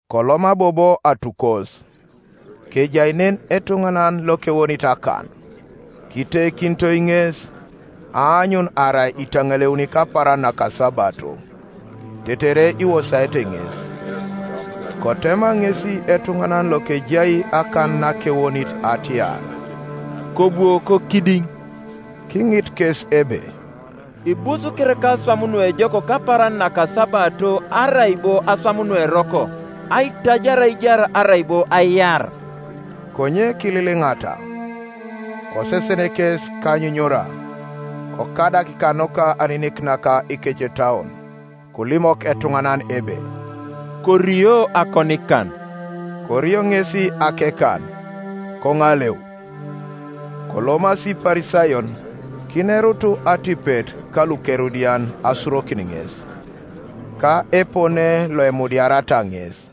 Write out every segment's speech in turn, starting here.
Koloma bobo atukos; kejai nen etuŋanan lokewonit akan. Kiteikinitoi ŋes, aanyun arai itaŋaleuni kapaaran nakasabato, tetere iwosaete ŋes. Kotema ŋesi etuŋanan lokejai akan nakewonit atiar, “Kobwo kokidiŋ.” Kiŋit kes ebe, “Ibus kereka aswam nuejok kapaaran nakasabato, arai bo aswam nueroko, aitajar aijar, arai bo aiar?” Konye kililiŋata. Kosesen kes kanyunyura, kokadak kanuka aninik naka ikecetauon, kolimok etuŋanan ebe, “Korio akonikan.” Korio ŋesi akekan, koŋaleu. Kolomasi Iparisayon, kinerutu atipet kaluKerodian asurokin ŋes, ka epone loemudiariata ŋes.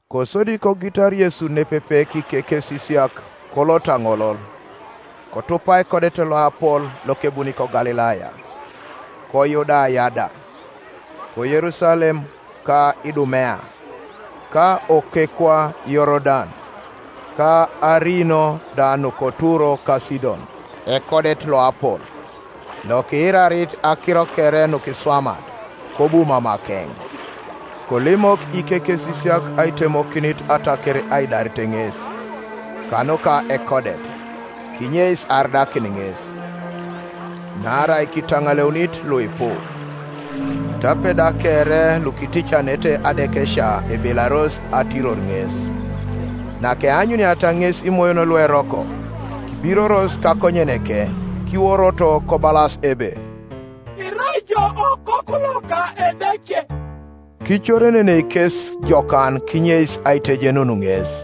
Kosodi kogitar Yesu nepepe kikekesisiak, kolot aŋolol, kotupa ekodet loapol lokebuni koGalilaya; koYudaya da, ko Yerusalem ka Idumea, ka okekwa Yorodan, ka ariino da nuka Turo ka Sidon, ekodet loapol, lokiirarit akiro kere nukiswamat, kobu mamakeŋ. Kolimok ikekesisiak aitemokinit ataker aidaret ŋes, kanuka ekodet, kinyeis aridakin ŋes; naarai kitaŋaleunit luipu, tape da kere lukiticanete adekesia ebelaros atiror ŋes. Nakeanyuniata ŋes imoyon lueroko, kibiroros kakonyeneke, kiworoto kobalas ebe, “Irai ijo Okoku loka Edeke.” Kicorenenei kes jokan kinyeis aitejenun ŋes.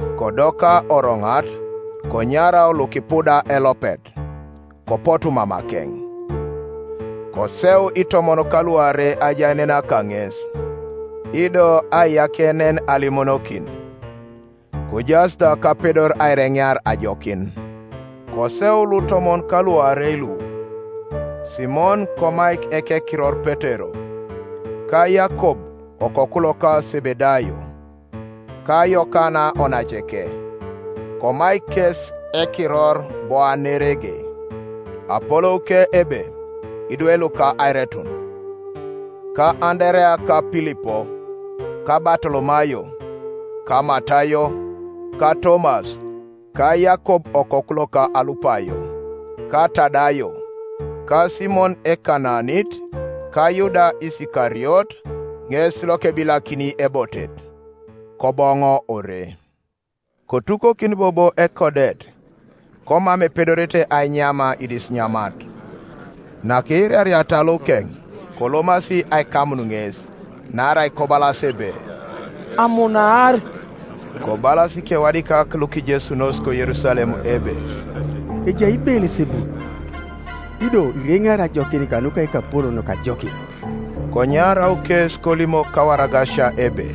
Kodoka oroŋat, konyarau lukipuda elopet; kopotu mamakeŋ. Koseu itomon kaluarei ajaenena kaŋes, ido aiyakienen alimonokin; kojaas da kapedor aireŋear ajokin. Koseu lutomon kaluarei lu: Simon, komaik ekekiror Petero; ka Yakob okoku loka Sebedayo, ka Yokana onaceke (komaik kes ekiror Boanerege, apolouke ebe, Idwe luka airetun); ka Anderea, ka Pilipo, ka Batolomayo, ka Matayo, ka Tomas, ka Yakob okoku loka Alupayo, ka Tadayo, ka Simon Ekanaanit ka Yuda Isikariot, ŋes lokebilakini ebotet. Koboŋo ore. Kotukokin bobo ekodet, komam epedorete ainyam idisinyamat. Nakiirariata lukeŋ, kolomasi aikamun ŋes, naarai kobalas ebe, “Amunaar.” Kobalas ikewadikak lukijesunos koYerusalem ebe, “Ejai Beelesebul, ido ireŋeari ajokin kanuka ekapolon loka ajokin.” Konyarau kes kolimok kawaragasia ebe,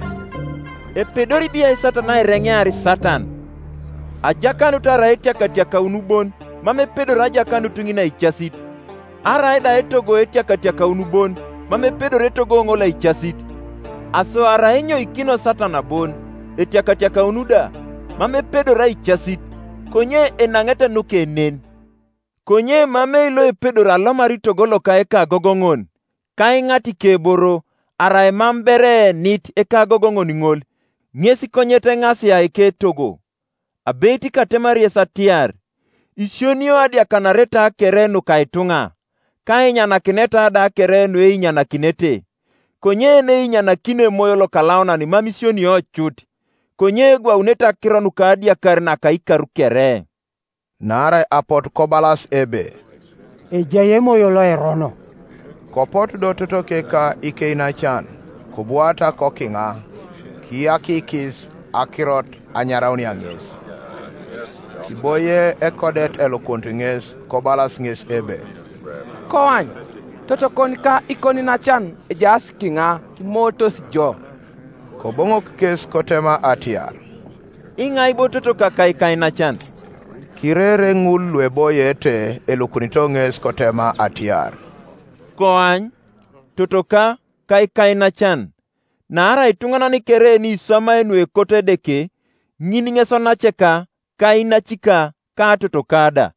“Epedori biai Satan aireŋear Satan? Ajakanut arai etiakatiakaun bon, mam epedori ajakanut ŋin aicasit. Arai da etogo etiakatiakaun bon, mam epedori etogo ŋol aicasit. Aso arai enyoikino Satan bon, etiakatiakaun da, mam epedori aicasit; konye enaŋete nuke nen, Konye emamei loepedori alomar togo loka ekagogoŋon, ka aiŋat ikeboro, arai mam ber eenit ekagogoŋon ŋol; ŋes konyet eŋasia eketogo. “Abeit katemari yes atiar, Isionio adiakanareta kere nuka ituŋa, ka ainyanakineta da kere nueinyanakinete; konye yeneinyanakini Emoyo Lokalaunan mam isionio cut; konye egwaunete akiro nukadiakar naka ikar kere.” Naarai apotu kobalas ebe, “Ejai emoyo loerono.” Kopotu do totoke ka ikeinacan; kobwaata kokiŋa, kiyakikis akirot anyaraunia ŋes, Kiboie ekodet elukunit ŋes; kobalas ŋes ebe, “Koany, totokon ka ikoniinacan ejaas kiŋa, kimootos jo.” Koboŋok kes kotema atiar, “Iŋai bo totoka ka ikainacan?” Kirere ŋul lueboiete elukunito ŋes, kotema atiar, “Koany, totoka, ka ikainacan! Naarai ituŋanan kere yeniswamai nuekoto Edeke, ŋin ŋes onaceka, ka inacika, ka totoka da.”